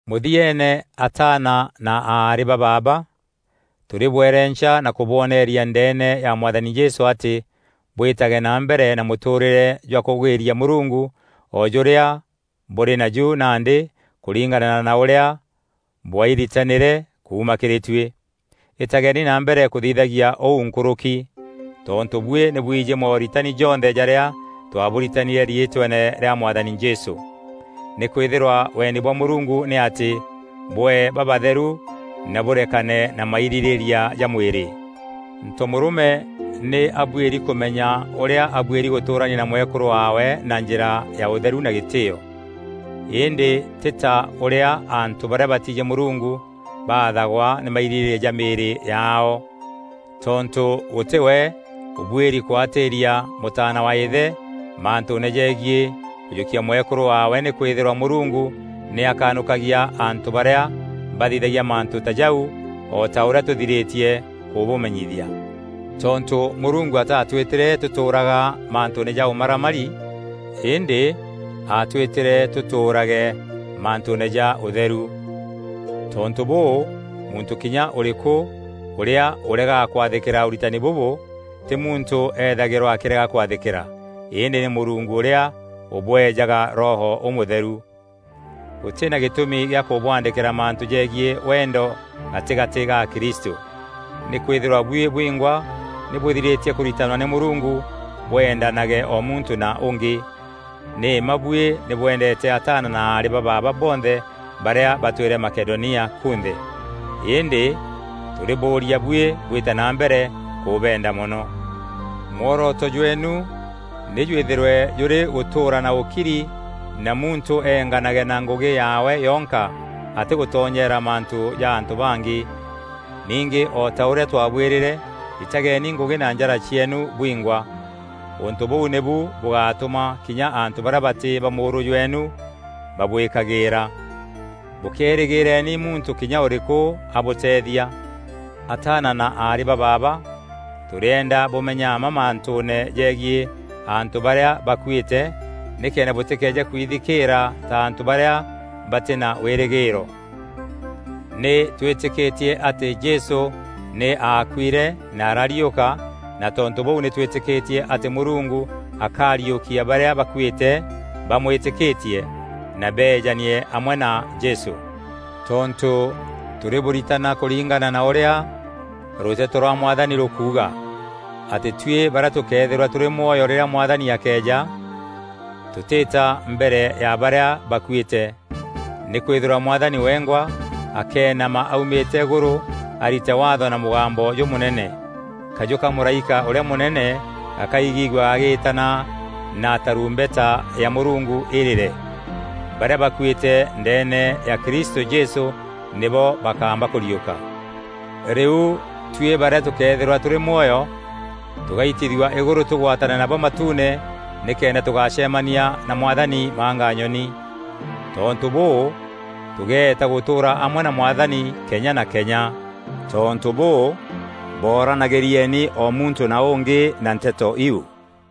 Mûthieene ataana na aarî ba baaba, tûrîbwerenca na kûbwoneeria ndeene ya Mwathani Jesû atî bwîtage na mbere na mûtûûrîre jwa kûgwîria Mûrungu o jûrîa bûrî naju nandî kûringana na ûrîa bwairitanîre kuuma kîrî tuî. Îtageni na mbere kûthithagia ûu nkûrûki. Tontû buî nî bwijî mooritani jonthe jarîa twaabûritanîre riîtweene rîa Mwathani Jesû. Nîkwîthîrwa wendi bwa Mûrungu nî atî bwee babatheru na bûrekane na mairîrîîria ja mwîrî. Ntomûrûme nî abuîri kûmenya ûrîa abuîri gûtûrania na mwekûrû waawe na njîra ya ûtheru na gîtîîo. Îndî tî ta ûrîa antû barîa batiijî Mûrungu baathagwa nî mairîrîîria ja mîîrî yaao. Tontû gûtî we ûbuîri kûatîria mûtaana wa îthe mantûûne jegiî kûjûkia mwekûrû waawe nîkwîthîrwa Mûrungu nî akanûkagia antû barîa bathithagia mantû ta jau o ta ûrîa tûthirîtie kûbûmenyithia. Tontû Mûrungu ataatwîtîre tûtûûraga mantûûne ja ûmaramari îndî aatwîtîre tûtûûrage mantûûne ja ûtheru. Tontû bûû, muntû kinya ûrîkû ûrîa ûregaga kwathîkîra ûritani bûbû tî muntû eethagîrwa akîrega kwathîkîra, îndî nî Mûrungu ûrîa ûbweejaga Roho Ûmûtheru. Gûtî na gîtûmi gîa kûbûandîkîra mantû jegiî wendo gatîgatî ga akristû. Nîkwîthîrwa buî bwingwa nî bûthirîtie kûritanwa nî Mûrungu bwendanage o muntû na ûngî. Nî mma buî nî bwendeete ataana na aarî ba baaba bonthe barîa batwîre Makedonia kunthe. Îndî tûrîbûûria buî bwîte na mbere kûbenda mono. Mworoto jweenu nî jwîthîrwe jûrî gûtûûra na ûkiri na muntû eenganage na ngûgî yaawe yonka atîgûtonyeera mantû ja antû bangî. Ningî, o ta ûrîa twabwîrîre, ritageni ngûgî na njara cieenu bwingwa. Ûntû bûu nîbu bûgatûma kinya antû barîa batî ba mûûrû jweenu babwîkagîîra. Bûkéerîgîîreni muntû kinya ûrîkû abûteethia. Ataana na aarî ba baaba, tûrîenda bûmenye mma mantûûne jegiî antû barîa bakuîte nîkenda bûtîkeeje kwithikîîra ta antû barîa batî na wîrîgîîro. Nî twîtîkîtie atî Jesû nî aakuîre na arariûka na tontû bûu nî twîtîkîtie atî Mûrungu akariûkia barîa bakuîte bamwîtîkîtie na beejanie amwe na Jesû. Tontû tûrîbûritana kûringana na ûrîa rûteto rwa Mwathani rûkuuga: atî tuî barîa tûkeethîrwa tûrî mwoyo rîrîa Mwathani akeeja, tûtîta mbere ya barîa bakuîte. Nîkwîthîrwa Mwathani wengwa akeenama aumîte îgûrû arite waatho na mûgambo jûmûnene. Kajû ka mûraîka ûrîa mûnene gakaigîgua gagîîtana na tarumbeta ya Mûrungu îrîre. Barîa bakuîte ndeene ya Kristû Jesû nîbo bakamba kûriûka, rîu tuî barîa tûkeethîrwa tûrî mwoyo, tûgaitithua îgûrû tûgwatane nabo matuune nîkenda tûgacemania na Mwathani manganyoni. Tontû bûû, tûgeeta gûtûûra amwe na Mwathani kenya na kenya. Tontû bûû, boranagîrieni o muntû na ûngî na nteto iu.